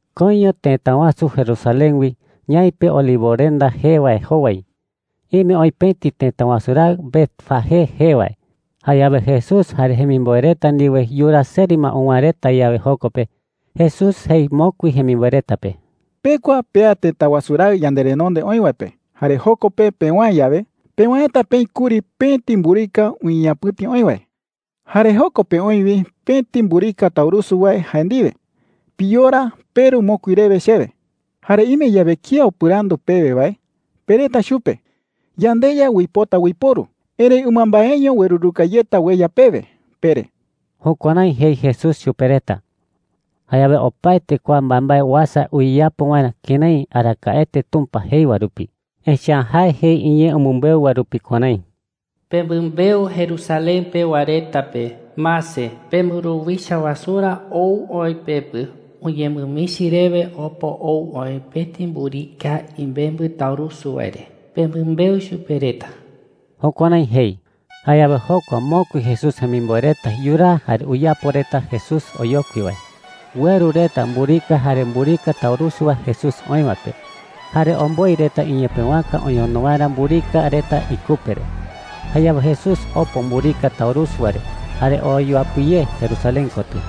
Koiño tëta wasu Jerusalén wi, ñaipe Olivorenda jee wae jowai, ime oï pëti tëta wasu raɨ Betfagé jee wae. Jayawe Jesús jare jemimboe reta ndiwe yuraa seri ma uwäe reta yawe joko pe, Jesús jei mokui jemimboe reta pe: “Pekua pea tëta wasu raɨ yanderenonde oï wae pe. Jare joko pe pewäe yawe, pewäeta peï kuri pëti mburika uñeñapɨ̈ti oï wae. Jare joko pe oï wi pëti mburika taurusu wae jae ndiwe. Piyora, peru mokui rewe chewe,” jei chupe reta. “Jare ime yawe kía upɨrandu pewe wae, pereta chupe: ‘YandeYa uipota uiporu, erëi ɨmambaeño ueruruka yeta ueya pewe,’ pere.” Jukuärái jei Jesús chupe reta. Jayawe opaete kua mbaembae uasa uyeyapo waerä kërái arakaete Tumpa jei wae rupi. Echa’ä jae jei iñee umɨmbeu wae rupi kuärái: “Pemɨmbeu Jerusalén pewa reta pe: ‘Mase, pemburuwicha wasurä ou oï pepɨ. Uñemɨmichi rewe opo ou oï pëti mburika imembɨ taurusu wae re,’ pemɨmbeu chupe reta.” Jukuärái jei. Jayawe jokua mokui Jesús jemimboe reta yuraa jare uyapo reta Jesús oyokui wae. Ueru reta mburika jare mburika taurusu wae Jesús oï wae pe, jare omboi reta iñepëwaka oñono waerä mburika reta ikupe re. Jayawe Jesús opo mburika taurusu wae re, jare oo yuapɨ ye Jerusalén kotɨ.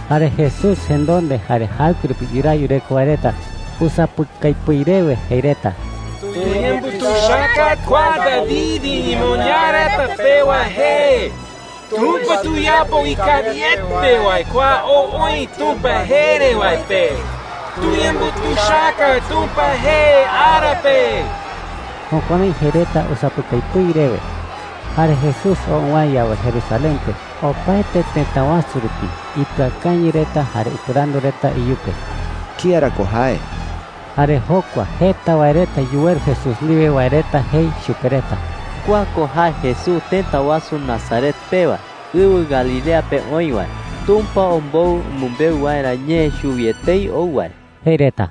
Jare Jesús jenonde jare jaɨkue rupi yuraa yureko wae reta usapɨkai pɨi rewe jei reta: “¡Tuyembutuichaka kua David iñemoñaa reta pewa jee! ¡Tumpa tuyapo ikawiete wae kua ou oï Tumpa jee re wae pe! ¡Tuyembutuichaka Tumpa jee ara pe!” Jukuärái jei reta usapɨkai pɨi rewe. Jare Jesús oo uwäe yawe Jerusalén pe, opaete tëta wasu rupi ipɨakañɨ reta jare upɨrandu reta iyupe: “¿Kía ra ko jae?” Jare jokua jeta wae reta yuweru Jesús ndiwe wae reta jei chupe reta: “Kua ko jae Jesús tëta wasu Nazaret pewa, ɨwɨ Galilea pe oï wae. Tumpa ombou umɨmbeu waerä ñee chuwi etei ou wae,” jei reta.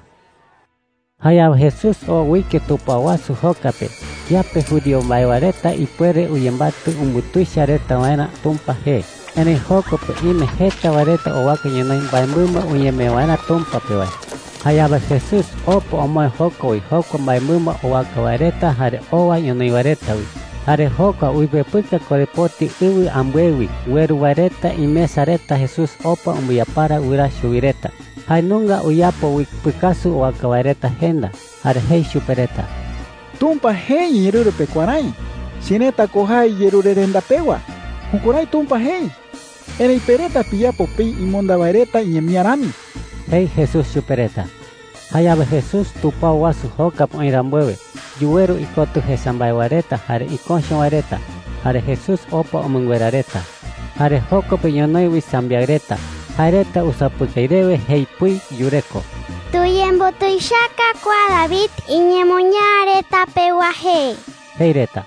Jayawe Jesús oo uike tupao wasu joka pe kiape judío mbae wae reta ipuere uyembatɨ umbutuicha reta waerä Tumpa jee. Erëi joko pe ime jeta wae reta owaka ñonoï mbaemɨmba uñemee waerä Tumpa pe wae. Jayawe Jesús opa omoë joko wi jokua mbaemɨmba owaka wae reta jare owa ñonoï wae reta wi. Jare jokua uipepɨka korepoti ɨwɨ ambɨe wi ueru wae reta imesa reta Jesús opa umbɨyapara wɨraa chuwi reta. Jae nunga uyapo wi pɨkasu Iparawete wae reta umee pɨkasu reta Tumpa pe, ïru mbaemɨmba reta umee ipepɨka pe. owaka wae reta jenda. Jare jei chupe reta: “Tumpa jei iñeerɨru pe kuärái: ‘Cherëta ko jae yerurerenda pewa.’ Jukuärái Tumpa jei. Erëi pe reta piyapo peï imonda wae reta iñemía rami,” jei Jesús chupe reta. Jayawe Jesús tupao wasu joka pe oï rambuewe, yuweru ikotɨ jesa mbae wae reta jare iköcho wae reta. Jare Jesús opa umɨnguera reta. Jare joko pe ñonoï wi sambiaɨ reta. Jae reta usapɨkai rewe jei pɨi yureko: “¡Tuyembutuichaka kua David iñemoñaa reta pewa jee!” jei reta.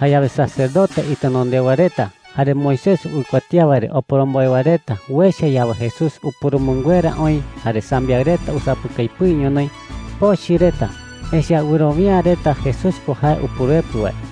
Jayawe sacerdote itenondewa reta jare Moisés uikuatía wae re oporomboe wae reta uecha yawe Jesús upurumɨnguera oï jare sambiaɨ reta usapɨkai pɨi ñonoï, pochɨ reta, echa’ä wɨrowia’ä reta Jesús ko jae Upuruepɨ wae.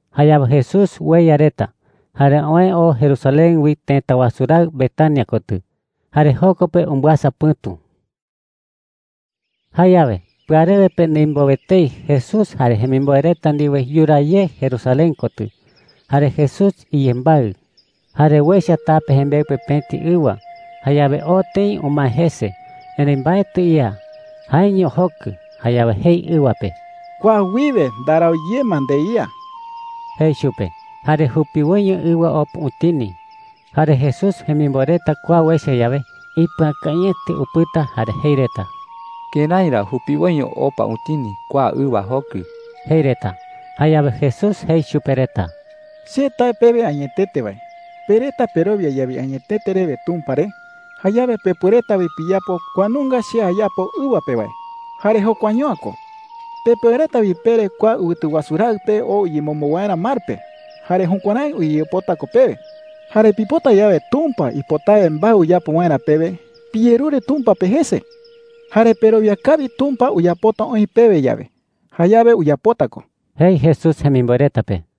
Jayawe Jesús ueya reta, jare oë oo Jerusalén wi tëta wasu raɨ Betania kotɨ, jare joko pe umbɨasa pɨ̈tu. Jayawe pɨarewe pe ndimbowe etei Jesús jare jemimboe reta ndiwe yuraa ye Jerusalén kotɨ. Jare Jesús iyembaɨ. Jare uecha tape jembeɨ pe pëti ɨwa. Ɨwa ko jee “higo” karái ñee pe. Jayawe oo tëi umae jese. Erëi mbaetɨ ía; jaeño jokɨ. Jayawe jei ɨwa pe: “Kua wiwe ndarau ye ma ndeía,” jei chupe. Jare jupiwoiño ɨwa opa utini. Jare Jesús jemimboe reta kua uecha yawe, ipɨakañɨete upɨta jare jei reta: “¿Kërái ra jupiwoiño opa utini kua ɨwa jokɨ?” jei reta. Jayawe Jesús jei chupe reta: “Che tae pewe añetete wae, pe reta perowia yawe añetete rewe Tumpa re, jayawe pepuereta wi piyapo kua nunga che ayapo ɨwa pe wae. Jare jokuaño’ä ko. Pepuereta wi pere kua ɨwɨtu wasu raɨ pe oo uyemombo waerä mar pe, jare jukuärái uyeyapota ko pewe,” jei. “Jare pipota yawe Tumpa ipotawe mbae uyapo waerä pewe, piyerure Tumpa pe jese. Jare perowia kawi Tumpa uyapota oï pewe yawe, jayawe uyapota ko,” jei Jesús jemimboe reta pe.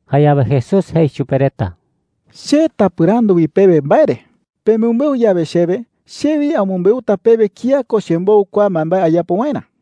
Jayawe Jesús jei chupe reta: “Che tapɨrandu wi pewe mbae re,” jei chupe reta. “Pemɨmbeu yawe chewe, che wi amɨmbeuta pewe kía ko chembou kua mbaembae ayapo waerä,” jei.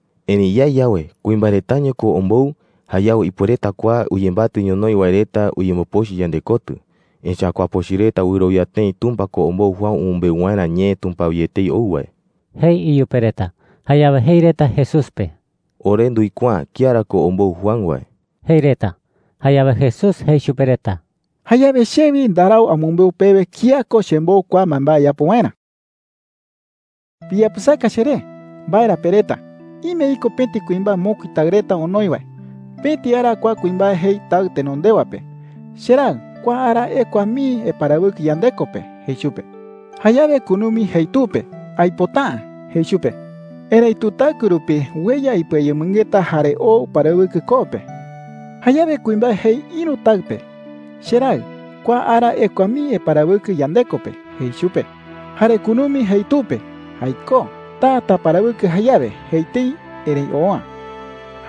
Erëi yae yawe, ‘Kuimbae retaño ko ombou,’ jayawe ipuereta kua uyembatɨ ñonoï wae reta uyembopochɨ yandekotɨ. Echa’ä kua pochɨ reta wɨrowia tëi Tumpa ko ombou Juan umɨmbeu waerä ñee Tumpa wi etei ou wae,” jei iyupe reta. Jayawe jei reta Jesús pe: “Ore nduikuaa’ä kía ra ko ombou Juan wae,” jei reta. Jayawe Jesús jei chupe reta: “Jayawe che wi ndarau amɨmbeu pewe kía ko chembou kua mbaembae ayapo waerä,” jei chupe reta. “Piyapɨsaka cheré. ¿Mbae ra pereta? Ime iko pëti kuimbae mokui taɨ reta onoi wae. Pëti ara kua kuimbae jei taɨ tenondewa pe: ‘Cheraɨ, kua ara ekua mii eparawɨkɨ yandeko pe,’ jei chupe. “Jayawe kunumi jei tu pe: ‘Aipota’ä,’ jei chupe. Erëitu taɨkue rupi ueya ipɨayemɨngeta jare oo uparawɨkɨ koo pe,” jei. “Jayawe kuimbae jei ïru taɨ pe: ‘Cheraɨ, kua ara ekua mii eparawɨkɨ yandeko pe,’ jei chupe. “Jare kunumi jei tu pe: ‘Jaikó. Taa taparawɨkɨ jayawe,’ jei tëi. Erëi oo’ä,” jei Jesús.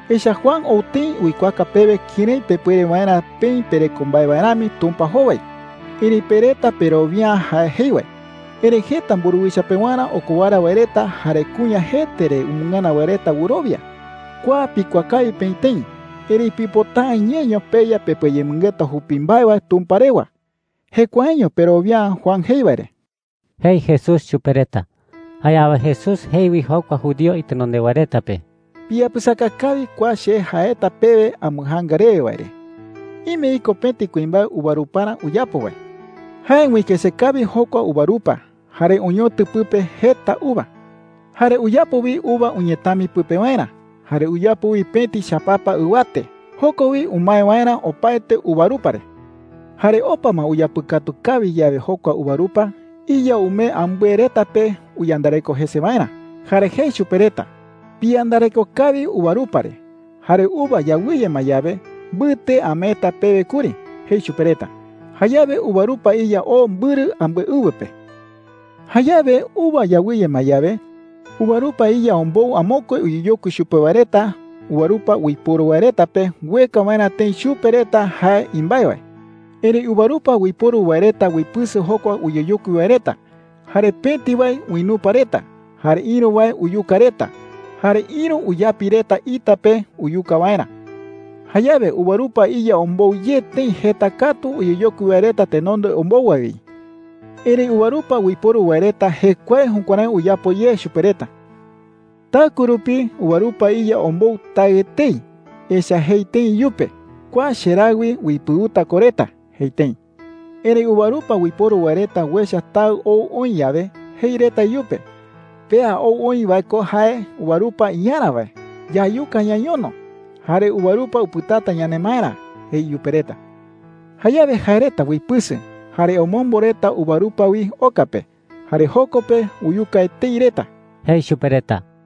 echa’ä Juan ou tëi uikuaaka pewe kërái pepuere waerä peï pereko mbae wae rami Tumpa jowai, erëi pe reta perowia’ä jae jei wae. Erëi jeta mburuwicha pewarä okowara wae reta jare kuña jete re umɨngana wae reta wɨrowia. Kua pikuaa kawi peï tëi, erëi pipota’ä ñeño peya pepɨayemɨngeta jupi mbae wae Tumpa rewa. Jekuaeño perowia’ä Juan jei wae re,” jei Jesús chupe reta. Jayawe Jesús jei wi jokua judío itenondewa reta pe: “Piyapɨsaka kawi kua che jaeta pewe ambɨjaanga rewe wae re: Ime iko pëti kuimbae uvaruparä uyapo wae,” jei chupe reta. “Jae uikëse kawi jokua uvarupa, jare oñotɨ pɨpe jeta uva,” jei. “Jare uyapo wi uva uñetami pɨpe waerä. Jare uyapo wi pëti chapapa ɨwate, joko wi umae waerä opaete uvarupa re,” jei. “Jare opa ma uyapɨkatu kawi yawe jokua uvarupa, iya umee ambɨe reta pe uyandareko jese waerä. Jare jei chupe reta: ‘Piyandareko kawi uvarupa re. Jare uva yawɨye ma yawe, mbɨte ameeta pewe kuri,’ jei chupe reta. Jayawe uvarupa iya oo mbɨrɨ ambɨe ɨwɨ pe,” jei Jesús. “Jayawe uva yawɨye ma yawe, uvarupa iya ombou amokue uyeyokui chupe wae reta uvarupa uiporu wae reta pe ueka waerä tëi chupe reta jae imbae wae. Erëi uvarupa uiporu wae reta uipɨsɨ jokua uyeyokui wae reta. Jare pëti wae uinupa reta, jare ïru wae uyuka reta, jare ïru uyapi reta ita pe uyuka waerä,” jei. “Jayawe uvarupa iya ombou ye tëi jeta katu uyeyokui wae reta tenonde ombou wae wi. Erëi uvarupa uiporu wae reta jekuae jukuärái uyapo ye chupe reta,” jei. “Taɨkue rupi uvarupa iya ombou taɨ etei. Echa’ä jei tëi iyupe: ‘Kua cheraɨ wi uipɨuta ko reta,’ jei tëi. “Erëi uvarupa uiporu wae reta uecha taɨ ou oï yawe, jei reta iyupe: ‘Pea ou oï wae ko jae uvarupa iyarä wae. Yayuka ñañono, jare uvarupa upɨtata yanemaerä,’ jei iyupe reta. Jayawe jae reta uipɨsɨ, jare omombo reta uvarupa wi oka pe, jare joko pe uyuka etei reta,” jei chupe reta.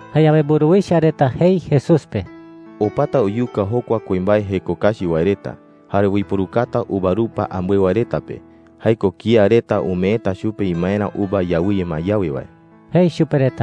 Jayawe mburuwicha reta jei Jesús pe: “Opata uyuka jokua kuimbae jeko kachi wae reta, jare uiporukata uvarupa ambɨe wae reta pe – jae ko kía reta umeeta chupe imaerä uva yawɨye ma yawe wae,” jei reta chupe.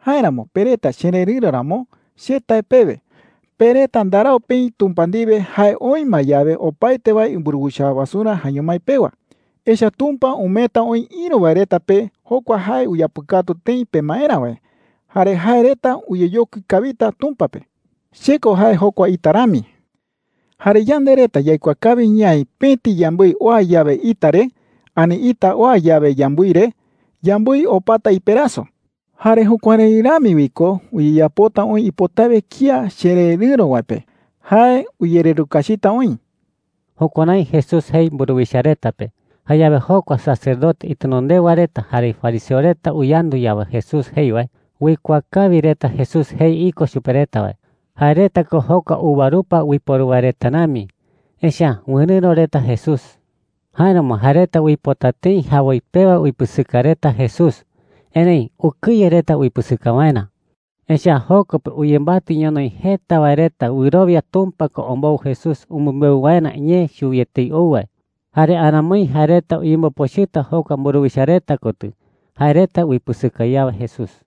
“Jáeramo pe reta chererɨ̈ro ramo, che tae pewe, pe reta ndarau peï Tumpa ndiwe jae oï ma yawe opaete wae imburuwicha wasurä jaeño mái pewa. Echa’ä Tumpa umeeta oï ïru wae reta pe jokua jae uyapɨkatu tëi pemaerä wae. Jare jae reta uyeyokui kawita Tumpa pe,” jei chupe reta. “Che ko jae jokua ita rami. Jare yande reta yaikuaa kawi ñaï pëti yambɨi oa yawe ita re, ani ita oa yawe yambɨi re, yambɨi opata iperaso,” jei. “Jare jukuärái rami wi ko uyeyapota oï ipotawe kía chererɨ̈ro wae pe. Jae uyererukachita oï.” Jukuärái Jesús jei mburuwicha reta pe. Jayawe jokua sacerdote itenondewa reta jare fariseo reta uyandu yawe Jesús jei wae, uikuaa kawi reta Jesús jei iko chupe reta wae – jae reta ko jokua uvarupa uiporu wae reta rami, echa’ä wɨrɨ̈ro reta Jesús. Jáeramo jae reta uipota tëi jawoi pewa uipɨsɨka reta Jesús. Erëi ukɨye reta uipɨsɨka waerä. Echa’ä joko pe uyembatɨ ñonoï jeta wae reta wɨrowia Tumpa ko ombou Jesús umɨmbeu waerä ñee chuwi etei ou wae. Jare aramoi jae reta uyembopochɨta jokua mburuwicha reta kotɨ, jae reta uipɨsɨka yawe Jesús.